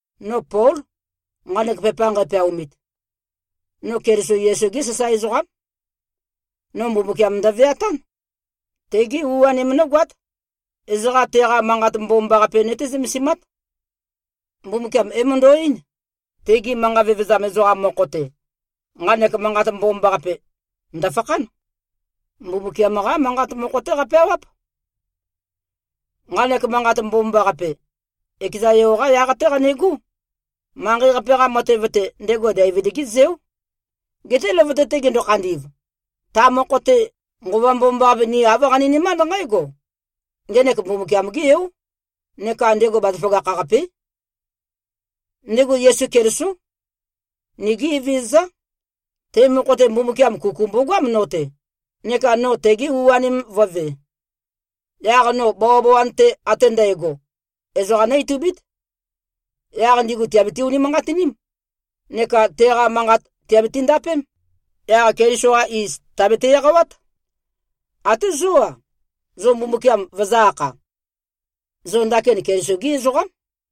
No Pól, nqanek pepa nqæpeaomit. No Keliso Yesu-gé sasae ezoqám. No Mbumbukiam ndøveatán. Tegé u-anem nógoát. Ezoqa teqa Manqat Mbomambaqape nøté-zømesimát. Mbumbukiam é-møndo꞉-eín, tegi manqa vevezam ezoqam mokho-te, nqanek Manqat Mbomambaqape, ndø̀fakhán. Mbumbukiam-qá Manqat mokho-té qapeawáp. Nqanek Manqat Mbomambaqape, ekeza Yo-qá yaq-té qanegó. Manqei-qape-qa matev-te, ndego Deivid-gé zeó. Geté løvøte-te gendo-khandi꞉v, ta mokho-te, Nqova Mbomambaqape, ni āv qaninømánd nqǽgo: Ngenek Mbumbukiam-gé Yó, neka ndego bazaføgakh-qapé. Ndego Yesu Kelisó. Nigí Evezøzá. Te mokho-te, Mbumbukiam kuku mbogoám no-te, neka no tege u-anem vø̄ve. Yaq no bawabawan-te ate ndægo, ezoqa nó-itubít. Yaq ndigu tìabiti-unimanqatiním neka teqa manqat tìabiti-ndapém. Yaq Keliso-qa iz tàbete-eqawát. Até zó-a, zo Mbumbukiam vøzø̄-akha. Zo ndakin Yesu Keliso-gí ezoqám.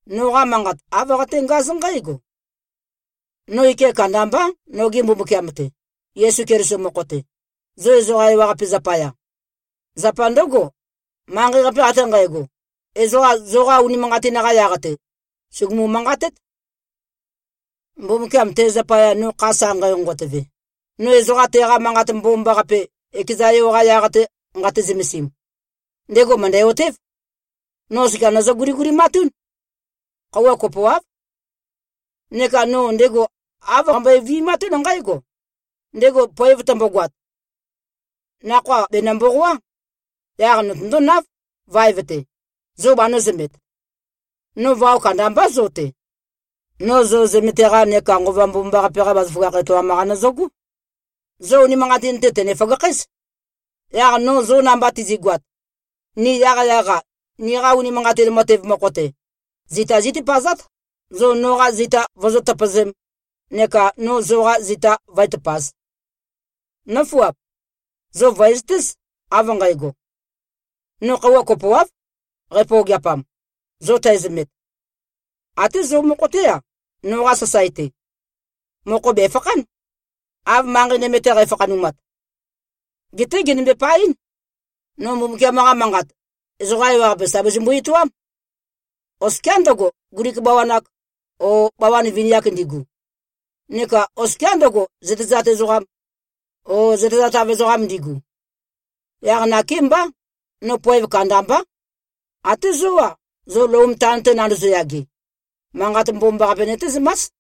Noqa manqat āv qaténgáz nqǽgo: No ike kandambá, noge Mbumbukiam-te, Yesu Keliso mokho-te, zo ezoqa ewaqape zapaya. Zapa ndǿgo, manqei-qape ate nqægo, ezoqa zoqa unimanqatin-qa yaq-te, sùgumu-manqatét. Mbumbukiam, te zapaya no kha sa nqæ-nqonqotøve, no ezoqa teqa Manqat Mbomambaqape, ekeza Yo-qa yaq-te nqate-zømesim, ndego mø̀ndæ-otév, no oskia nøzø-guligulimatún. Khøuwa kopoáv. Neka no ndego āv qambøe-vi꞉matún nqǽgo: Ndego poev tømbogoat, nakhoa bènø-mboqoá. Yaq notøndónáv, vaev-te, zo banø̄zømet. No vao kandambá zo-te. No zo zømete-qa neka Nqova Mbomambaqape-qa bazaføgakh etoam-qa nøzøgó. Zo unimanqatin-te, tø̀ne-føgakhǽz. Yaq no zo namba tizi꞉goat, ni yaqyaq-a, niqa unimanqatin matev mokho-te, zita zítøpøzát, zo noqa zita vozó-tøpøzēm, neka no zoqa zita vǿe-tøpāz. Nǿfuap! Zo vø̀ezøtéz, av nqægo: No khøuwa kopoáv, qæpøogeapam, zo tæzømet. Até zo mokho-té-a, noqa sasae-te, mokho bèfakhán, av manqei nøme-te qæfakhanumat. Geté gènømbe-paɨ́n. No Mbumbukiam-qa Manqat, ezoqa ewaqape sà bazømbu-etoám, oskiá ndøgo, Glik bawan-ak o bawan vini-ak ndigu, neka oskiá ndøgo, zøtezat ezoqam o zøtezatav ezoqam ndigu. Yaq nakémbá, no poev kandambá. Até zó-a, zo Lom taon-te nandozo-yage, Manqat Mbomambaqape nøtézømás.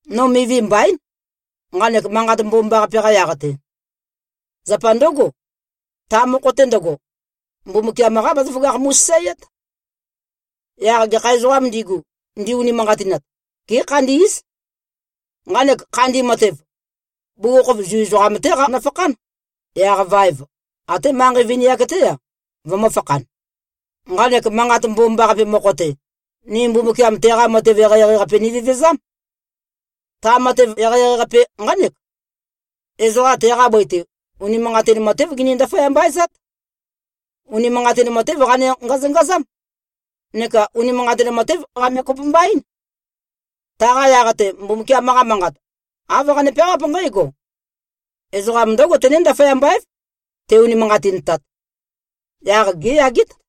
No mivi mbaín, nqanek Manqat Mbomambaqape-qa yaq-te. Zapa ndǿgo, ta mokho-te ndøgo, Mbumbukiam-qá bazaføgakh mu꞉sasaeát. Yaq gekha ezoqām ndigu, ndi-unimanqatinat, gékhandí꞉z. Nqanek khandi matev, bugukhokhof Zu ezoqam-té qanøfakhán. Yaq vaev, até manqei vini-ak-té-a, vømø̄fakhan. Nqanek Manqat Mbomambaqape mokho-te, ni Mbumbukiam teqa matev eqeieqei-qape nivevezám. Ta matev eqeieqei-qape nqánek: Ezoqa teqa bøi-te, unimanqatin matév gini-ndaføyamba-ezát. Unimanqatin matév qane-ngazøngazám neka unimanqatin matév qame-kopømba-ín. Taqa yaq-te, Mbumbukiam-qa Manqat, āv qane-peawáp nqǽgo, “Ezoqam ndǿgo tené-ndaføyamba-év, te-unimanqatintat. Yaq géyagét.”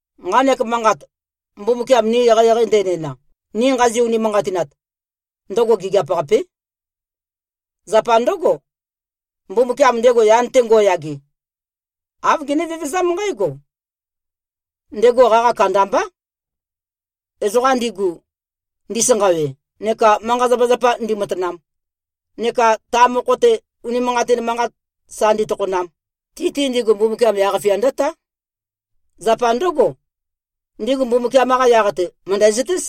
⌞Nqanek manqat, Mbumbukiam ni eqeieqei ndenæna, ni nqazi-unimanqatinat, ndøgo gigiap-qapé.⌟ Zapa ndǿgo, Mbumbukiam, ndego yan-te ngo꞉yage, āv gene-vevezám nqǽgo: Ndego qaqa kandambá. Ezoqa ndigu, ndisanqawe neka manqa-zapazapa ndimatanam, neka ta mokho-te, unimanqatin manqat sa nditokhonam, ti-te ndigu, Mbumbukiam yaq-fia ndǿtá. Zapa ndǿgo, ndigu Mbumbukiam-qa yaq-te, mø̀ndæzøtéz.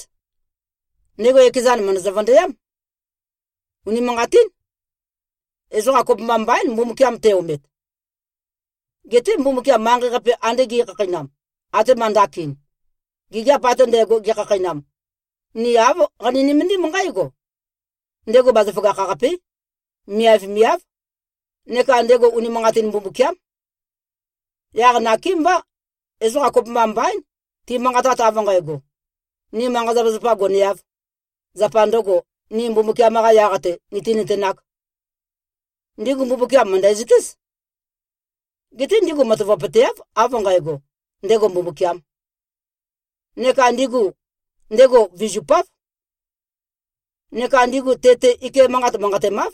Ndego ekezan mø̀ndøzø-vøndøyám. Unimanqatín. Ezoqa kopømba mbaín, Mbumbukiam te-omet. Geté Mbumbukiam manqei-qape ande ge꞉khakheinam, atema ndakin, gigiap ate ndægo, gekhakheinam, ni āv qani-nømendím nqǽgo: Ndego bazaføgakh-qapé, miavmiáv, neka ndego unimanqatin Mbumbukiám. Yaq nakémbá, ezoqa kopømba mbaín, timanqatat av nqægo, “Ni manqa-zapazapa goneāv, zapa ndø̄go, ni Mbumbukiam-qa yaq-te nìtinøtenāk.” Ndigu Mbumbukiam mø̀ndæzøtéz. Geté ndigu matavapøteáv, av nqægo, ndego Mbumbukiām. Neka ndigu ndego vizupáv. Neka ndigu te-te ike manqat manqatemáv.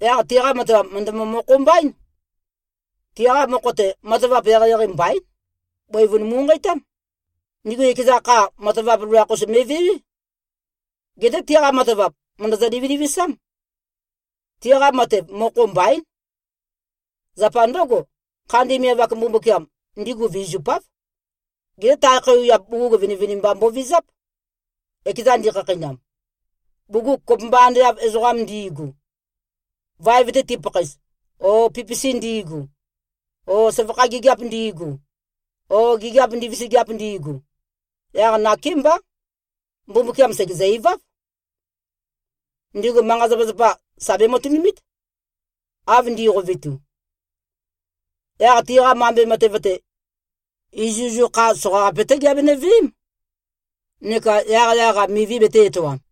Yaq tiqa matavap mø̀ndømø-mokho-mbaín. Tiqa mokho-te, matavap eqeieqei mbaín. Bøivun mu꞉nqeitám. Ndigu ekeza kha, matavap loloakh-us me꞉vewé. Geté tiqa matavap, mø̀ndøzø-livilivisám. Tiqa matev, mokho mbaín. Zapa ndǿgo, khandi miav-ak Mbumbukiam, ndigu vizupáv. Geté tae khøuwiap bugug vinivinimba mbovizáp, ekezan ndikhakheinam, bugug kopømba ande av ezoqam ndi꞉gu, vaev-te tipakhaez, o pipisi ndi꞉gu o søvakha gigiap ndi꞉gu o gigiap ndivisigiap ndi꞉gu. Yaq nakémbá, Mbumbukiam sègezø-iváv. Ndigu manqa-zapazapa, sà bematønumít, av ndi꞉qovetu. Yaq tiqa mambe matev-te, izuizu kha soqaqape-té giabenø-veém, neka yaqyaq-a mivi betē-etoam.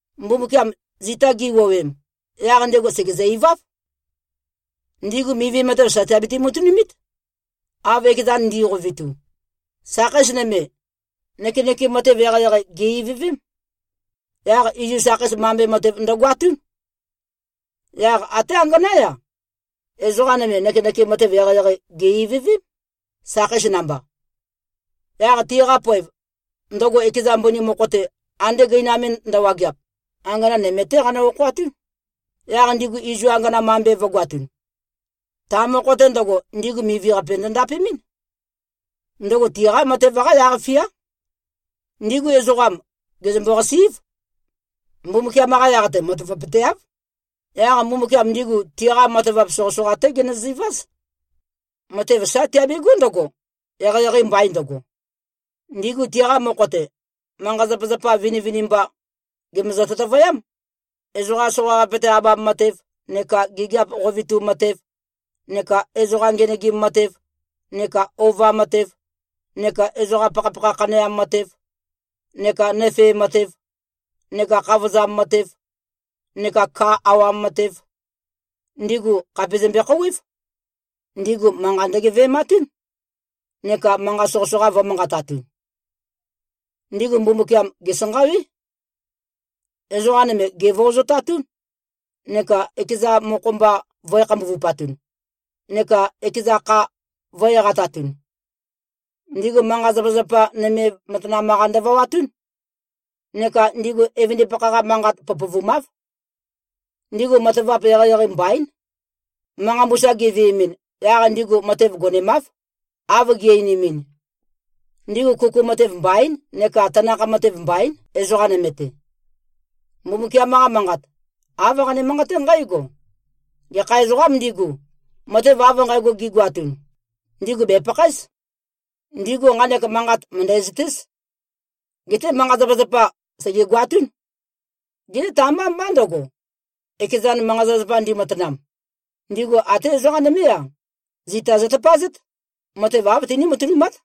Mbumbukiam zita gi꞉wuowem, yaq ndego sègezø-iváv. Ndigu mivi matev, sà tiabiti-matønumít, av ekezan ndi꞉qovetu. Sakheis nøme, nøkenøkem matev eqeieqei, gè-ivøvém. Yaq izu sakheis mambe matev ndøgoatún. Yaq até anganá-ya, ezoqa nøme, nøkenøkem matev eqeieqei, gè-ivøvém, sakheis namba. Yaq tiqa poev, ndøgo ekeza mbøni mokho-te ande gøinam me ndøwageap, angana nøme-té qanø-okhoatún, yaq ndigu izu angana mambe matev vø̄goatun. Ta mokho-te ndøgo, ndigu mivi-qape ndø-ndapemɨ́n. Ndøgo tiqa matev-qá yaq-fiá. Ndigu ezoqam, gèzømbo-qasí꞉v. Mbumbukiam-qa yaq-te matavapøteáv. Yaq Mbumbukiam ndigu tiqa matavap soqøsoqa-té genøziváz. Matev sá tiabegó ndøgo, eqeieqei mbain ndøgo. Ndigu tiqa mokho-te, manqa-zapazapa vinivinimba gèmøzø-tøtøvøyám. Ezoqa soqaqape-te abam matev, neka gigiap qovetu matev, neka ezoqa ngenøgim matev, neka ova matev, neka ezoqa pakhapakha khaneam matev, neka nøfee matev, neka khavozam matev, neka ka awam matev, ndigu khàpe zømbe-khouwév. Ndigu manqa ndøgeve꞉matún, neka manqat soqøsoqa vø̄manqatatun. Ndigu Mbumbukiam gèsanqawé. Ezoqa nøme gèvøozotatún neka ekeza mokho-mba vø̄e-khambuvupatun neka ekeza kha vø̄-eqatatun. Ndigu manqa-zapazapa nøme matanam-qa ndøvawatún. Neka ndigu evøndipakha-qa manqat pøpøvumáv. Ndigu matavap eqeieqei mbaín. Manqa mbusa giveemɨn, yaq ndigu matev gonemáv, av gi꞉-einimin. Ndigu kuku matev mbaín neka tanakh matev mbaín, ezoqa nøme-te. Mbumbukiam-qa Manqat, āv qane-manqaté nqǽgo, “Gekha ezoqām ndigu, matev av nqægo gigoatun, ndigu bèpakhaéz.” Ndigu nqanek manqat mø̀ndæzøtéz. Geté manqa-zapazapa sègegoatún. Geté ta-mbá mbá ndøgo, ekezan manqa-zapazapa ndimatanam. Ndigu até ezoqa nømé-a, zita zøtøpazét. Matev āv tiní-matønumát.